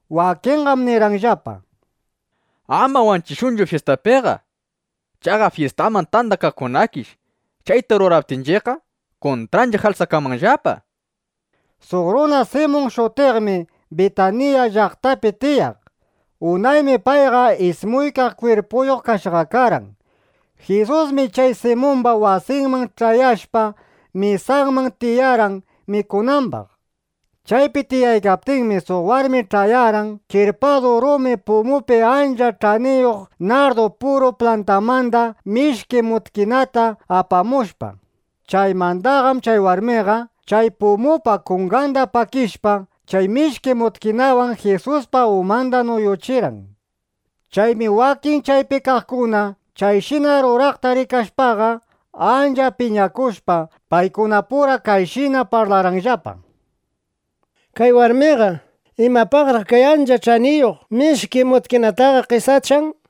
Wakinqam nirqanllapa: —Ama wanchishunchu fyistapiqa. Chaqa fyistaman tandakaqkunakish, chayta ruraptinchiqqa, kuntranchiq alsakanmanllapa, nishpa. Suq runa Simun shutiqmi Bitanilla (Bitaniya) llaqtapi tiyaq. Unaymi payqa ismuykaq kwirpuyuq kashqa karqan. Jisusmi chay Simumba wasinman ch'ayashpa, mesaman tiyarqan mikunambaq. Chaypi tiyaykaptinmi, suq warmi ch'ayarqan kirpadu rumi pumupi ancha ch'aniyuq nardu puru plantamanda mishki mutkinata apamushpa. Chaymandaqam chay warmiqa chay pumupa kunganda pakishpa, chay mishki mutkinawan Jisuspa umanda nuyuchirqan. Chaymi wakin chaypi kaqkuna chayshina ruraqta rikashpaqa, ancha piñakushpa, paykunapura kayshina parlarqanllapa: —Kay warmiqa, ¿imapaqraq kay ancha ch'aniyuq mishki mutkinataqa qesachan?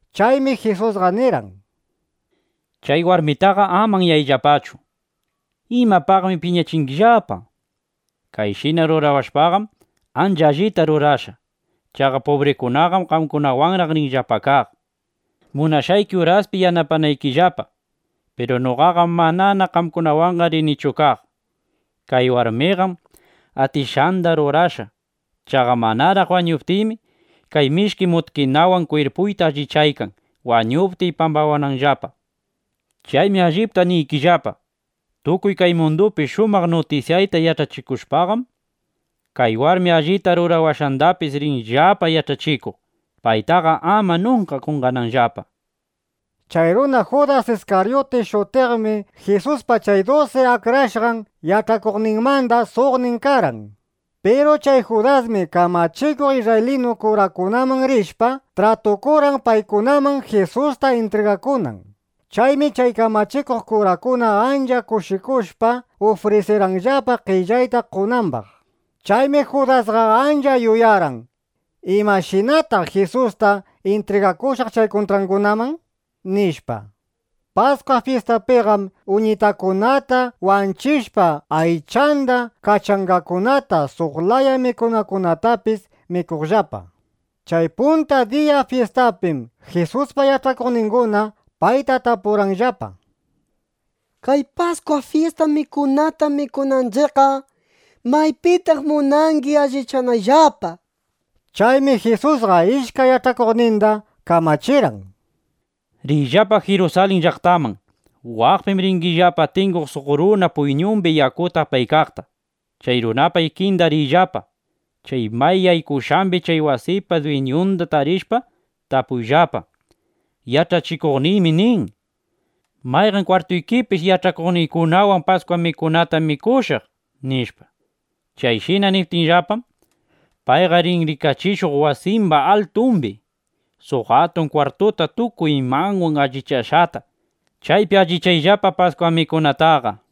Chaymi Jisusqa nirqan: —Chay warmitaqa ama anyayllapachu. ¿Imapaqmi piñachingillapa? Kayshina rurawashpaqam, ancha allita rurashqa. Chaqa pubrikunaqam qamkunawanraq rinllapa kaq, munashqayki uraspi yanapanaykillapa. Piru noqaqam manana qamkunawanqa rinichu kaq. Kay warmiqam atishqanda rurashqa. Chaqa manaraq wañuptiymi, kay mishki mutkinawan kwirpuyta allichaykan, wañuptiy pambawananllapa. Chaymi allipta niykillapa, tukuy kay mundupi shumaq nutisyayta yach'achikushpaqam, kay warmi allita rurawashqandapis rinllapa yach'achikuq, paytaqa ama nunka qonqananllapa, nishpa. Chay runa Judas Iskaryuti shutiqmi Jisuspa chay dusi akrashqan yach'akuqninmanda suqnin karqan. Piru chay Judasmi kamachikuq isrraylinu kurakunaman rishpa, tratukurqan, paykunaman Jisusta intrigakunan. Chaymi chay kamachikuq kurakuna ancha kushikushpa, ufrisirqanllapa qellayta qonambaq. Chaymi Judasqa ancha yuyarqan: ¿Imashinataq Jisusta intrigakushaq chay kuntraqkunaman? nishpa. Paskwa fyistapiqam uñitakunata wanchishpa, aychanda, kachangakunata, suq laya mikunakunatapis mikuqllapa. Chay punta diya fyistapim Jisuspa yach'akuqninguna payta tapurqanllapa: —Kay Paskwa fyista mikunata mikunanchiqqa, ¿maypitaq munangi allichanayllapa? nishpa. Chaymi Jisusqa ishkay yach'akuqninda kamachirqan: —Riyllapa Jirusalin llaqtaman. Waqpim ringillapa tinguq suq runa puyñumbi yakuta apaykaqta. Chay runapa ikinda riyllapa. Chay may yaykushqambi chay wasipa dwiñunda tarishpa, tapuyllapa: “Yach'achikuqniymi nin: ¿Mayqan kwartuykipish yach'akuqniykunawan Paskwa mikunata mikushaq?” nishpa. Chayshina niptikillapam, payqa rin rikachishuq wasimba altumbi suq atun kwartuta tukuy imawan allichashqata. Chaypi allichayllapa Paskwa mikunataqa, nishpa.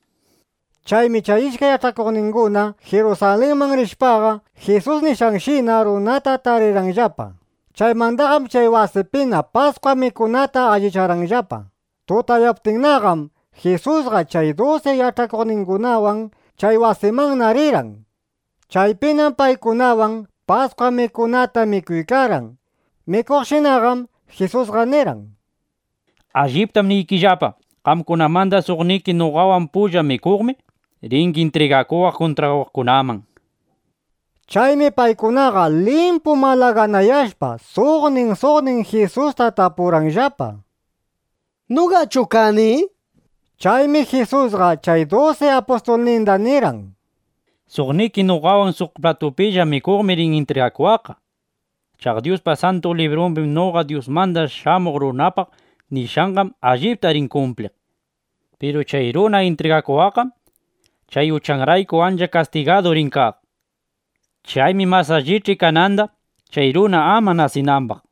Chaymi chay ishkay yach'akuqninguna Jirusalinman rishpaqa, Jisus nishqanshina runata tarirqanllapa. Chaymandaqam chay wasipina Paskwa mikunata allicharqanllapa. Tutayaptinnaqam Jisusqa chay dusi yach'akuqningunawan chay wasimanna rirqan. Chaypinam paykunawan Paskwa mikunata mikuykarqan. Mikuqshinaqam Jisusqa nirqan: —Alliptam niykillapa, qamkunamanda suqniki noqawan pulla mikuqmi, ringi intrigakuwaq kuntrawaqkunaman, nishpa. Chaymi paykunaqa limpu malaganayashpa, suqnin suqnin Jisusta tapurqanllapa: —¿Noqachu kani? nishpallapa. Chaymi Jisusqa chay dusi apustulninda nirqan: —Suqniki noqawan suq platupilla mikuqmi rin intrigakuwaqqa. Chaqa Dyuspa Santu Librumbi noqa Dyusmanda Shamuq Runapaq nishqanqam allipta rin kumpliq. Piru chay runa intrigakuwaqqam chay uchanrayku ancha kastigadu rin kaq. ¡Chaymi mas allich'i kananda, chay runa ama nasinambaq!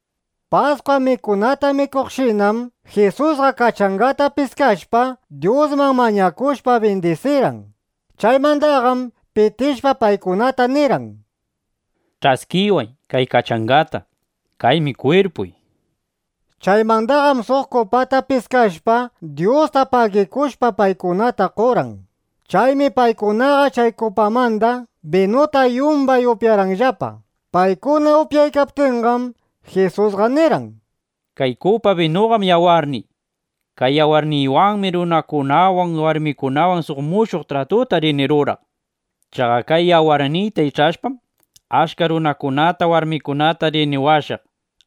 Paskwa mikunata mikuqshinam Jisusqa kachangata piskashpa, Dyusman mañakushpa, bindisirqan. Chaymandaqam pitishpa, paykunata nirqan: —Ch'askiway kay kachangata. Kaymi kwirpuy, nishpa. Chaymandaqam suq kupata piskashpa, Dyusta pagikushpa paykunata qorqan. Chaymi paykunaqa chay kupamanda binuta yumbay upyarqanllapa. Paykuna upyaykaptinqam Jisusqa nirqan: —Kay kupa binuqam yawarniy. Kay yawarniywanmi runakunawan, warmikunawan suq mushuq tratuta rini ruraq. Chaqa kay yawarniyta ich'ashpam, achka runakunata, warmikunata rini washaq.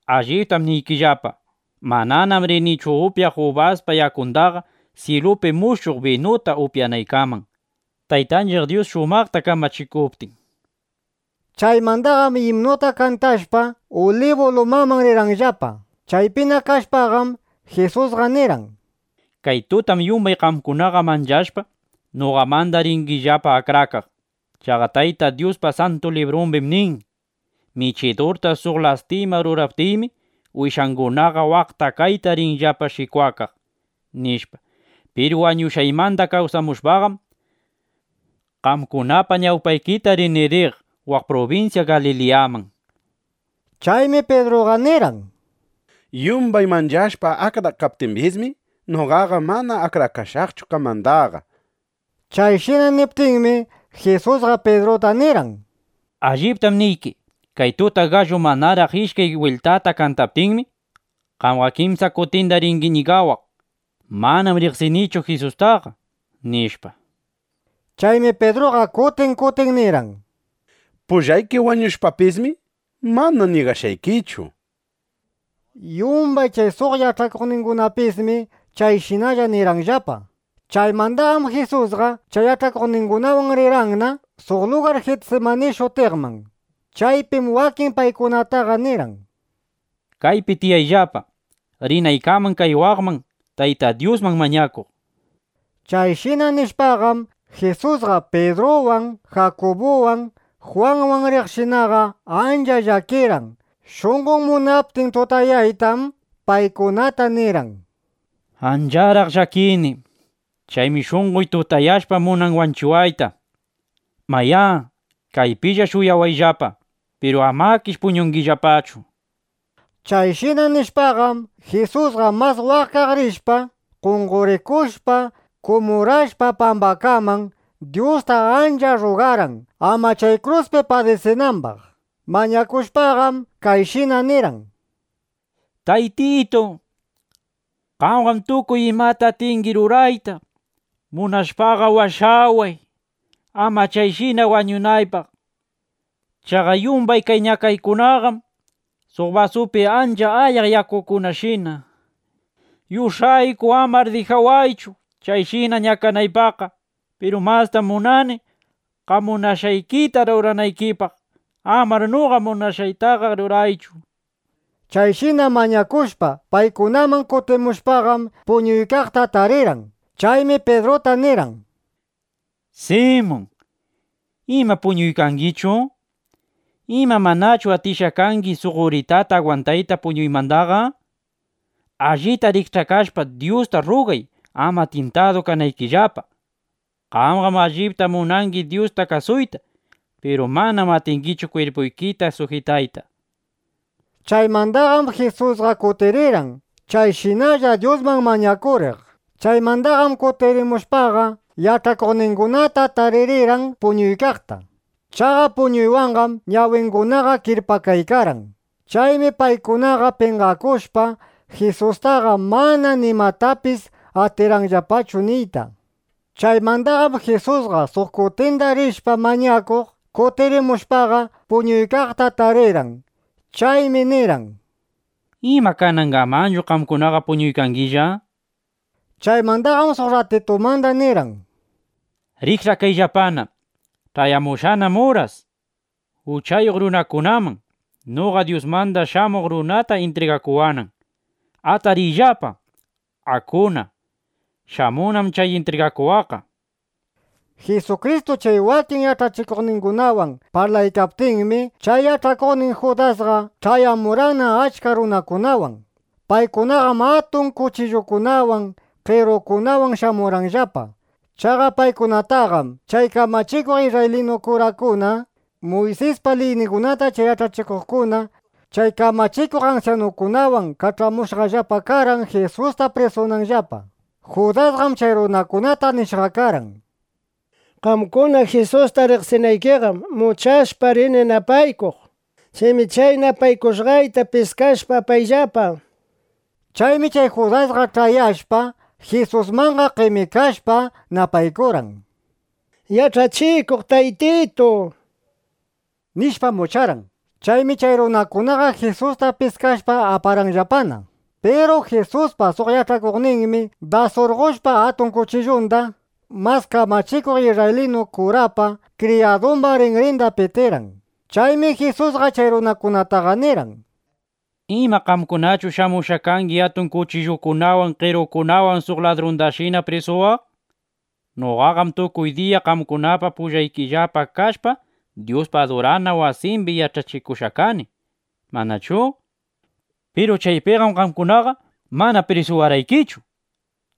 Alliptam niykillapa, mananam rinichu upyaq ubaspa yakundaqa, syilupi mushuq binuta upyanaykaman, Taytanchiq Dyus shumaqta kamachikuptin, nishpa. Chaymandaqam imnuta kantashpa, Ulibu lumamanna rirqanllapa. Chaypina kashpaqam, Jisusqa nirqan: —Kay tutam yumbay qamkunaqa manchashpa, noqamanda ringillapa akrakaq. Chaqa Tayta Dyuspa Santu Librumbim nin: “Michidurta suq lastima ruraptiymi, wishangunaqa waqta kayta rinllapa shikwakaq”, nishpa. Piru wañushqaymanda kawsamushpaqam, qamkunapa ñawpaykita rini riq waq prubinsya Galiliyaman, nishpa. Chaymi Pidruqa nirqan: —Yumbay manchashpa akrakaptimbismi, noqaqa mana akrakashaqchu qamandaqa. Chayshina niptinmi, Jisusqa Pidruta nirqan: —Alliptam niyki, kay tuta gallu manaraq ishkay bwiltata kantaptinmi, qamqa kimsa kutinda ringi ñigawaq: “Manam riqsinichu Jisustaqa”, nishpa. Chaymi Pidruqa kutin kutin nirqan: —Pullayki wañushpapismi, mana ñigashqaykichu, nishpa. Yumbay chay suq yach'akuqningunapismi chayshinalla nirqanllapa. Chaymandaqam Jisusqa chay yach'akuqningunawan rirqanna suq lugar Jitsimani shutiqman. Chaypim wakin paykunataqa nirqan: —Kaypi tiyayllapa, rinaykaman kay waqman, Tayta Dyusman mañakuq, nishpa. Chayshina nishpaqam, Jisusqa Pidruwan, Jakubuwan, Jwanwan riqshinaqa, ancha llakirqan. Shunqon munaptin tutayaytam, paykunata nirqan: —Ancharaq llakini. Chaymi shunqoy tutayashpa munan wanchiwayta. Mayá, kaypilla shuyawayllapa. Piru amakish puñungillapachu, nishpa. Chayshina nishpaqam, Jisusqa mas waqkaq rishpa, qonqorikushpa, kumurashpa pambakaman, Dyusta ancha rrugarqan, ama chay kruspi padisinambaq. Mañakushpaqam, kayshina nirqan: —Taytitu, qamqam tukuy imata atingi rurayta. Munashpaqa washaway, ama chayshina wañunaypaq. Chaqa yumbay kay ñakaykunaqam suq basupi ancha ayaq yakukunashina. Yush'ayku amar dijawaychu, chayshina ñakanaypaqqa. Piru mastam munani qam munashqaykita ruranaykipaq. Amar noqa munashqaytaqa ruraychu, nishpa. Chayshina mañakushpa, paykunaman kutimushpaqam, puñuykaqta tarirqan. Chaymi Pidruta nirqan: —Simun, ¿ima puñuykangichu? ¿Ima manachu atishqa kangi suq uritata agwantayta puñuymandaqa? Allita rikch'akashpa, Dyusta rrugay, ama tyintadu kanaykillapa. Qamqam allipta munangi Dyusta kasuyta. Piru manam atingichu kwirpuykita sujitayta, nishpa. Chaymandaqam Jisusqa kutirirqan, chayshinalla Dyusman mañakuriq. Chaymandaqam kutirimushpaqa, yach'akuqningunata taririrqan puñuykaqta. Chaqa puñuywanqam ñawingunaqa kirpakaykarqan. Chaymi paykunaqa penqakushpa, Jisustaqa mana nimatapis atirqanllapachu niyta. Chaymandaqam Jisusqa suq kutinda rishpa mañakuq, kutirimushpaqa, puñuykaqta taririrqan. Chaymi nirqan: —Puñuyllapana, samayllapana, nishpa. (Chaymandaqam suq rratitumanda nirqan:) —Rikch'akayllapana. Ch'ayamushqanam uras, uchayuq runakunaman noqa Dyusmanda Shamuq Runata intrigakuwanan. Atariyllapa. Akuna. Shamunnam chay intrigakuwaq, nishpa. Jisukristu chay wakin yach'akuqninwan parlaykaptinmi, chay yach'akuqnin Judasqa ch'ayamurqanna achka runakunawan. Paykunaqam atun kuchillukunawan, qerukunawan shamurqanllapa. Chaqa paykunataqam chay kamachikuq isrraylinu kurakuna, Muysispa liyningunata chay yach'achikuqkuna, chay kamachikuq ansyanukunawan kach'amushqallapa karqan, Jisusta prisunanllapa. Judasqam chay runakunata nishqa karqan: —Qamkuna Jisusta riqsinaykiqam, muchashpa rini napaykuq. Chaymi chay napaykushqayta piskashpa, apayllapa, nishpa. Chaymi chay Judasqa ch'ayashpa, Jisusmanqa qemikashpa, napaykurqan: —Yach'achikuq Taytitu, nishpam, mucharqan. Chaymi chay runakunaqa Jisusta piskashpa aparqanllapana. Piru Jisuspa suq yach'akuqninmi das surqoshpa atun kuchillunda, mas kamachikuq isrraylinu kurapa kriyadumba rinrinda pitirqan. Chaymi Jisusqa chay runakunataqa nirqan: —¿Ima qamkunachu shamushqa kangi atun kuchillukunawan, qerukunawan, suq ladrundashina prisuwaq? Noqaqam tukuy diya qamkunapa pullaykillapa kashpa, Dyuspa adurana wasimbi yach'achikushqa kani, ¿manachu? Piru chaypiqam qamkunaqa mana prisuwarqaykichu.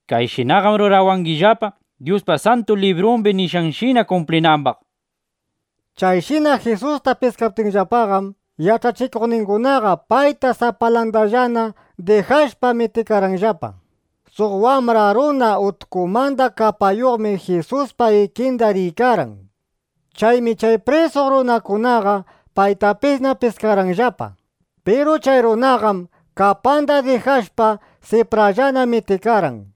Kayshinaqam rurawangillapa, Dyuspa Santu Librumbi nishqanshina kumplinambaq, nishpa. Chayshina Jisusta piskaptinllapaqam, yach'akuqningunaqa payta sapalandallana dijashpa, mitikarqanllapa. Suq wambra runa utkumanda kapayuqmi Jisuspa ikinda riykarqan. Chaymi chay prisuq runakunaqa paytapisna piskarqanllapa. Piru chay runaqam, kapanda dijashpa, siprallana mitikarqan.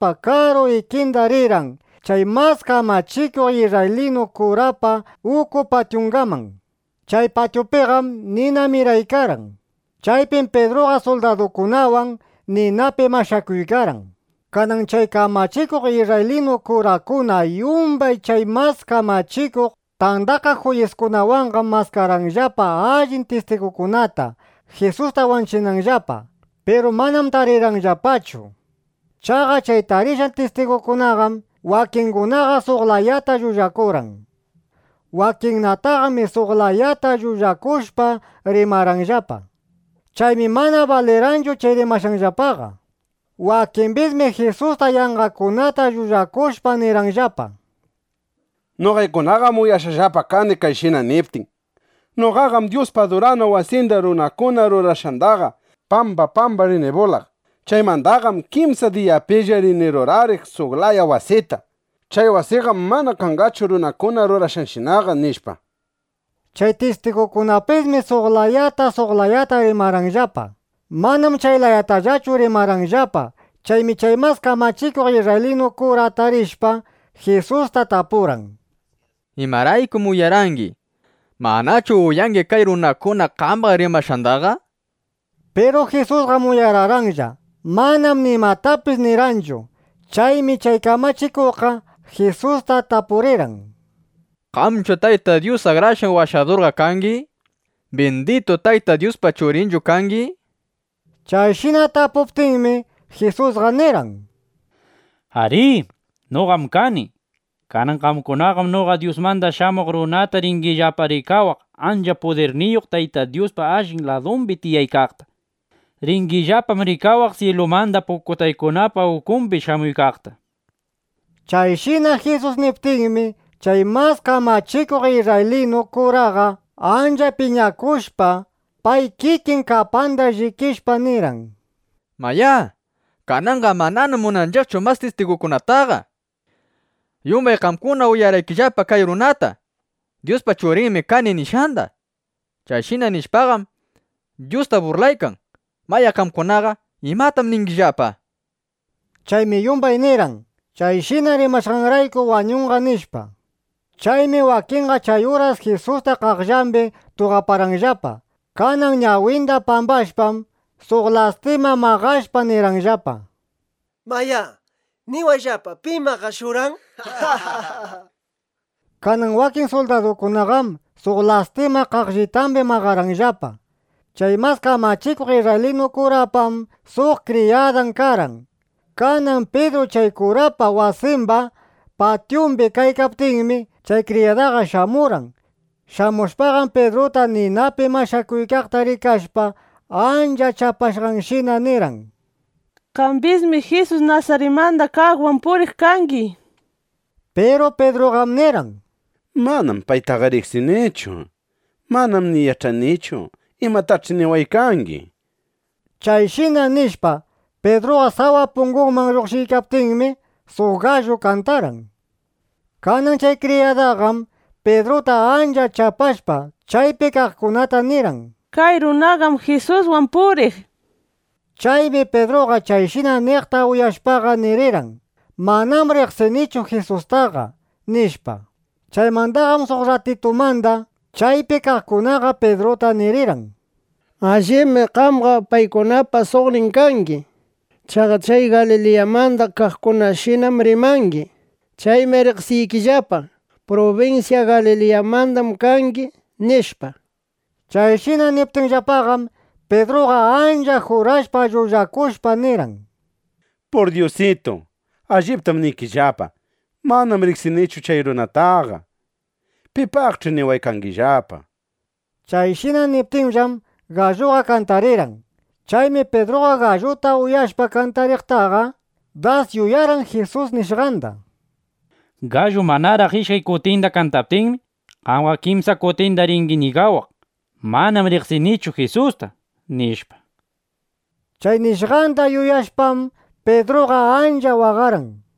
Kanan Pidruqam Jisuspa karu ikinda rirqan chay mas kamachikuq isrraylinu kurapa uku patyungaman. Chay patyupiqam nina miraykarqan. Chaypim Pidruqa suldadukunawan ninapi mashakuykarqan. Kanan chay kamachikuq isrraylinu kurakuna yumbay chay Mas Kamachikuq Tandakaq Juyiskunawanqam maskarqanllapa allin tistigukunata, Jisusta wanchinanllapa; piru manam tarirqanllapachu. Chaqa chay tarishqan tistigukunaqam wakingunaqa suq layata llullakurqan. Wakinnataqmi suq layata llullakushpa rimarqanllapa. Chaymi mana balirqanchu chay rimashqanllapaqa. Wakimbismi Jisusta yanqakunata llullakushpa nirqanllapa: —Noqaykunaqam uyashqallapa kani kayshina niptin: “Noqaqam Dyuspa adurana wasinda runakuna rurashqandaqa pamba pamba rini bulaq. Chaymandaqam kimsa diyapilla rini rurariq suq laya wasita. Chay wasiqam mana kanqachu runakuna rurashqanshinaqa”, nishpa. Chay tistigukunapismi suq layata suq layata rimarqanllapa. Manam chay layatallachu rimarqanllapaqa. Chaymi chay mas kamachikuq isrraylinu kura atarishpa, Jisusta tapurqan: —¿Imaraykum uyarangi? ¿Manachu uyangi kay runakuna qambaq rimashqandaqa? nishpa. Piru Jisusqam uyararqanlla. Manam nimatapis nirqanchu. Chaymi chay kamachikuqqa Jisusta tapurirqan: —¿Qamqachu Tayta Dyus Akrashqan Washadur kangi? ¿Binditu Tayta Dyuspa Churinchu kangi? nishpa. Chayshina tapuptinmi, Jisusqa nirqan: —Arí, noqam kani. Kanan qamkunaqam noqa Dyusmanda Shamuq Runata ringillapa rikawaq ancha pudirniyuq Tayta Dyuspa allin ladumbi tiyaykaqta. Ringillapam rikawaq syilumanda pukutaykunapa ukumbi shamuykaqta, nishpa. Chayshina Jisus niptinmi, chay mas kamachikuq isrraylinu kuraqa ancha piñakushpa pay kikin kapanda llikishpa, nirqan: —¡Mayá, kananqa mananam munanchiqchu mas tistigukunataqa! Yumbay qamkuna uyarqaykillapa kay runata: “Dyuspa Churinmi kani”, nishqanda. Chayshina rimashpaqam, Dyusta burlaykan. Mayá, qamkunaqa ¿imatam ningillapa? nishpa. Chaymi yumbay nirqan: —Chayshina rimashqanrayku wañunqa, nishpa. Chaymi wakinqa chay uras Jisusta qaqllambi tuqaparqanllapa. Kanan ñawinda pambashpam, suq lastima maqashpa nirqanllapa: —Mayá, niwayllapa: ¿Pim maqashurqan? nishpa. Kanan wakin suldadukunaqam suq lastima qaqllitambi maqarqanllapa. Chay mas kamachikuq isrraylinu kurapam suq kriyadan karqan. Kanan Pidru chay kurapa wasimba patyumbi kaykaptinmi, chay kriyadaqa shamurqan. Shamushpaqam, Pidruta ninapi mashakuykaqta rikashpa, ancha chapashqanshina nirqan: —Qambismi Jisus Nasaritmanda kaqwan puriq kangi, nishpa. Piru Pidruqam nirqan: —Manam paytaqa riqsinichu. Manam ni yach'anichu imatach'i niwaykangi, nishpa. Chayshina nishpa, Pidruqa sawa punguman lluqshiykaptinmi, suq gallu kantarqan. Kanan chay kriyadaqam Pidruta ancha chapashpa, chaypi kaqkunata nirirqan: —Kay runaqam Jisuswan puriq, nishpa. Chaymi Pidruqa chayshina niqta uyashpaqa nirirqan: —Manam riqsinichu Jisustaqa, nishpa. Chaymandaqam suq rratitumanda chaypi kaqkunaqa Pidruta nirirqan: —Allibmi qamqa paykunapa suqnin kangi. Chaqa chay Galiliyamanda kaqkunashinam rimangi. Chaymi riqsiykillapa, prubinsya Galiliyamandam kangi, nishpa. Chayshina niptinllapaqam, Pidruqa ancha jurashpa llullakushpa nirqan: —¡Pur dyusitu, alliptam niykillapa, manam riqsinichu chay runataqa! Pipaqch'i niwaykangillapa, nishpa. Chayshina niptinllam, galluqa kantarirqan. Chaymi Pidruqa galluta uyashpa kantariqtaqa, das yuyarqan Jisus nishqanda: “Gallu manaraq ishkay kutinda kantaptinmi, qamqa kimsa kutinda ringi ñigawaq: ‘Manam riqsinichu Jisusta’”, nishpa. Chay nishqanda yuyashpam, Pidruqa ancha waqarqan.